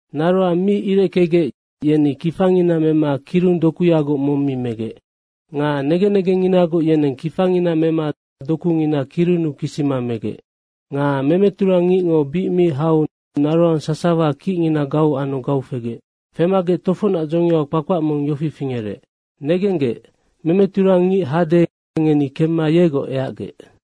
Naroang mi ireckegec, yeni kifangina mema kirung dokuyagoc mong mi megec. Nga negen negengnginagoc, yeneng kifangina mema dokungina kirunnu kisima megec. Nga memeturang ngicngo bic mi hau naroang sasawango kicngina gau anu gau fegec. Femagec tofocnac dzongiau kpakpac mong yofi fingerec, ‘Negenggec, memeturang ngic hade, ngeni kemma yegoc eacgec.’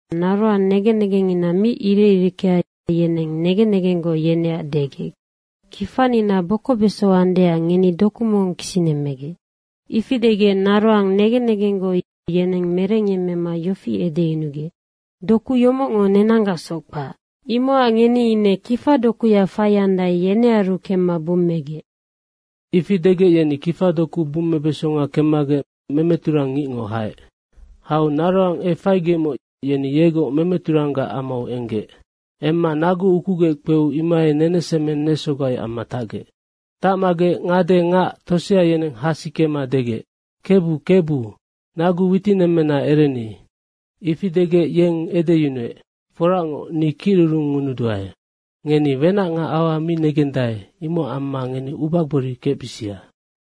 naroang negen negengngina mi irec ireckea, yeneng negen negenggoc yeneac degec, ‘Kifanina bokobeso andeac ngeni doku mong kisinemmegec.’ Ifi degec naroang negen negenggoc, yeneng merengyemmema yofi edeyunugec, ‘Doku yomocngo nenanggacsoc kpac. Imocac ngeni ine kifadokuya faiandae, yenearu kemma bummegec.’ Ifi degec, yeni kifadoku bummebesonga kemmagec memeturang ngicngo haec. Hau naroang efaigecmoc, yeni yegoc memeturanggac amau enggec. Emma nagu ukugec kpeu imohai nenesemeng nesogai amma tacgec. Tacmagec ngade ngac tosea yeneng hasikema degec, ‘Kebu, Kebu, nagu witinemmena ereni.’ Ifi degec, yeng edeyunuec, ‘Foracngoc, ni kicrurungngunuduae.’ Ngeni wenac nga aua mi negendae, imocac amma ngeni ubagbori kecbisia.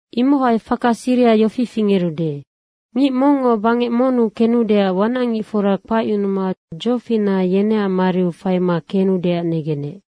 Imohai faka siriha yofi fingerude. Ngic mongngo bangec monnu kenudeac wanacngicfora kpacyunuma dzofinaha yeneac mariu faima kenudeac negenec.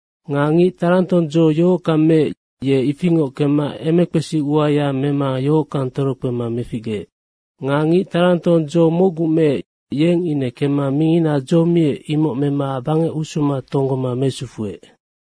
Nga ngic tarantong dzo yohockang meec, ye ifingoc kemma emekpesi uaya mema yohockang torokpema meficgeec. Nga ngic tarantong dzo mocgu meec, yeng ine kemma mingina dzo miec, imoc mema bangec usuma tonggoma mesufuec.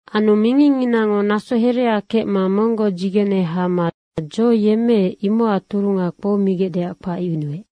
Anu mingingnginango naso herea kecma monggoc dzigene hama dzo yemmeec, imocac turunga kpoumigecdeac kpacyunuec.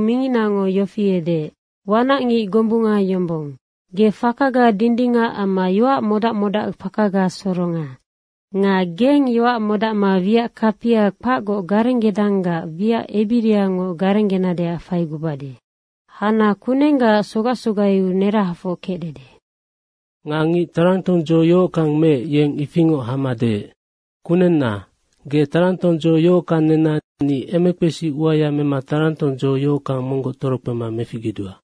minginango yofi edeec, ‘Wanacngic gombunga yombong. Ge fakaga dindingac amma yoac modac modacfakaga soronga. Nga geng yoac modacma wiac kapia kpacgoc garenggedanggac wiac ebiriangoc garenggenadeac faigubade. Hana kunenggaac sogac sogaiu nerahafoc kecdede.’ Nga ngic tarantong dzo yohockang meec, yeng ifingoc hama deec, ‘Kunenna, ge tarantong dzo yohockang nenna ni emekpesi uaya mema tarantong dzo yohockang monggoc torokpema meficgedua.’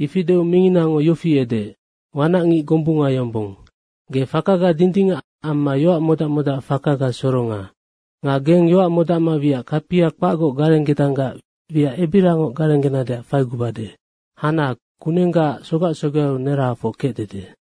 Ifi deu minginango yofi edeec, ‘Wanacngic gombunga yombong. Ge fakaga dindingac amma yoac modac modacfakaga soronga. Nga geng yoac modacma wiac kapia kpacgoc garenggedanggac wiac ebiriangoc garenggenadeac faigubade. Hana kunenggaac sogac sogaiu nerahafoc kecdede.’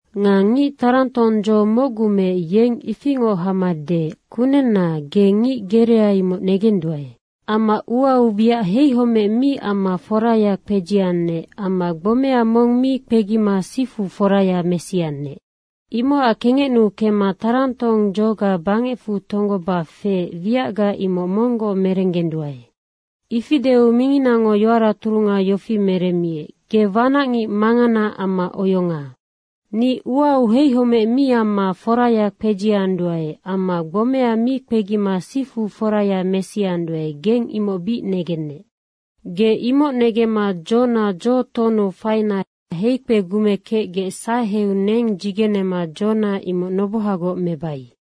Nga ngic tarantong dzo mocgu meec, yeng ifingoc hama deec, ‘Kunenna, ge ngic gerea, imoc negenduae. Amma uau wiac heihomec mi amma foraya kpedziannec amma gbomea mong mi kpegima sifu foraya mesiannec. Imocac kengecnuu kemma tarantong dzoga bangecfu tonggoba feec wiacga imoc monggoc merenggenduae.’ Ifi deu minginango yoara turunga yofi meremmiec, ‘Ge wanacngic mangana amma oyonga. Ni uau heihomec mi amma foraya kpedzianduae amma gbomea mi kpegima sifu foraya mesianduae, geng imoc bic negennec. Ge imoc negemma dzona dzo tohonnu faina heikpegumekecgec saheu neng dzigenema dzona imoc nobohagoc mebai.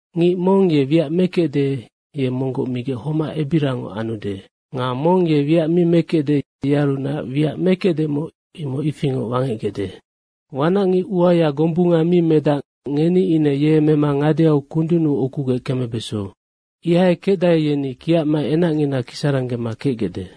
Ngic mong ye wiac mekecde, ye monggoc migec homac ebiriangoc anude. Nga mong ye wiac mi mekecde, yearunac wiac mekecdemoc, imoc ifingoc wangecgecde. Wanacngic uaya gombunga mi medac, ngeni ine ye mema ngadeau kundunnu ukugec kemebeso. Ihai kecdae, yeni kiacma enacngina kisaranggema kecgecde.’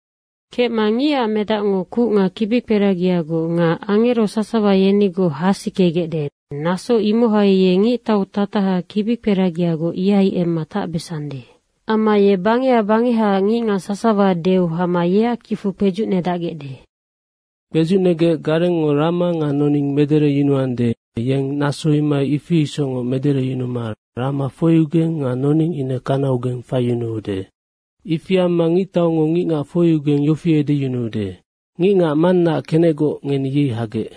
Kecma Ngicac Medacngo kuc nga kibikperagiagoc nga angero sasawa yenigoc hasikegecde, naso imohai ye ngictau tataha kibikperagiagoc ihai emma tacbesande. Amma ye bangeha bangehaac ngicngac sasawa deu hama yeac kicfu kpedzucnedacgecde. Kpedzucnegec garengngo rama nga noning medereyunuande, yeng naso imohai ifi isocngoc medereyunuma rama foiugeng nga noning ine kanaugeng faiyunuude. Ifi amma ngictaungo ngicngac foiugeng yofi edeyunuude, ‘Ngicngac Mannaac kenecgoc, ngeni yei hagec.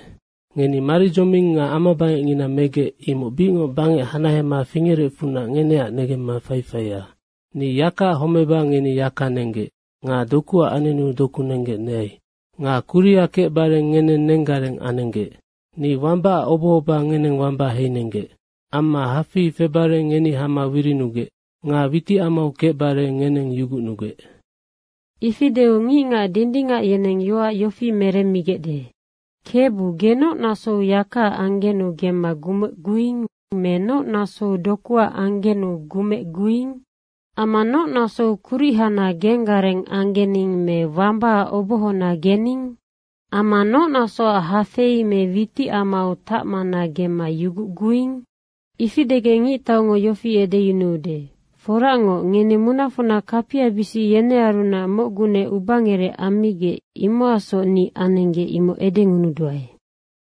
Ngeni maridzoming nga amabangecngina megec, imoc bicngoc bangec hanahema fingerecfunac ngeneac negemma faifaia. Ni yakaac homeba ngeni yaka nenggec nga dokuac anenu doku nenggec neai. Nga kuriha kecbare ngeneng nenggareng anenggec. Ni wambaac obohoba ngeneng wamba heinenggec. Amma hafei febare ngeni hama wirinugec. Nga witicamau kecbare ngeneng yugucnugec.’ Ifi deu ngicngac dindingac yeneng yoac yofi meremmigecde, ‘Kebu, ge noc nasou yakaac anggenu gemma gumecguing me noc nasou dokuac anggenu gumecguing? Amma noc nasou kuric hana genggareng anggening me wambaac obohona gening? Amma noc nasoac hafei me witicamau tacmana gemma yugucguing?’ Ifi degec ngictaungo yofi edeyunuude, ‘Foracngoc, ngeni munafocna kapiabisic yenearunac mocgunec ubangerec ammigec, imocacsoc ninoc anenggec.’ imoc edengunuduae.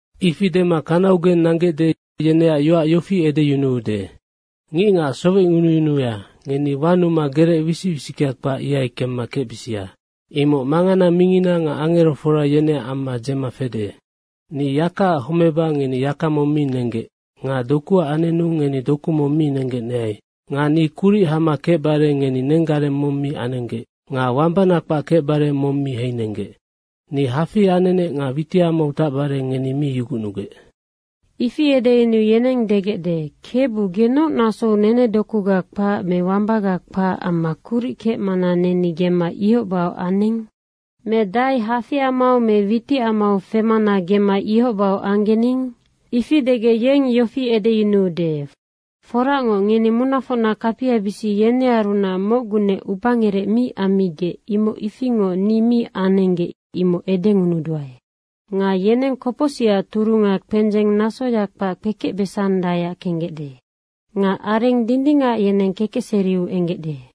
Ifi dema kanaugeng nanggecde, yeneac yoac yofi edeyunuude, ‘Ngicngac sowecngunungunuya, ngeni wanuma gerec wisic wisickea kpac, imohai kemma kecbisia. Imoc mangana mingina nga angerofora, yeneac amma dzema fede. Ni yakaac homeba ngeni yaka mong mi nenggec nga dokuac anenu ngeni doku mong mi nenggec neai. Nga ni kuric hama kecbare ngeni nenggareng mong mi anenggec nga wambana kpac kecbare mong mi heinenggec. Ni hafei anenec nga witicamau febare ngeni mi yugucnugec.’ Ifi edeyunuu yeneng degecde, ‘Kebu, ge noc nasou nenedokuga kpac me wambaga kpac amma kuric kecmana neni gemma ihoc bahoc aning? Me dahai hafeiamau me witicamau femana gemma ihoc bahoc anggening?’ Ifi degec yeng yofi edeyunuude, ‘Foracngoc, ngeni munafocna kapiabisic yenearunac mocgunec ubangerec mi ammigec, imoc ifingoc ni mi anenggec, imoc edengunuduae.’ Nga yeneng kopocsicac turunga kpendzeng nasoya kpac kpekecbesandaeac kenggecde. Nga areng dindingac yeneng kekecseriu enggecde.”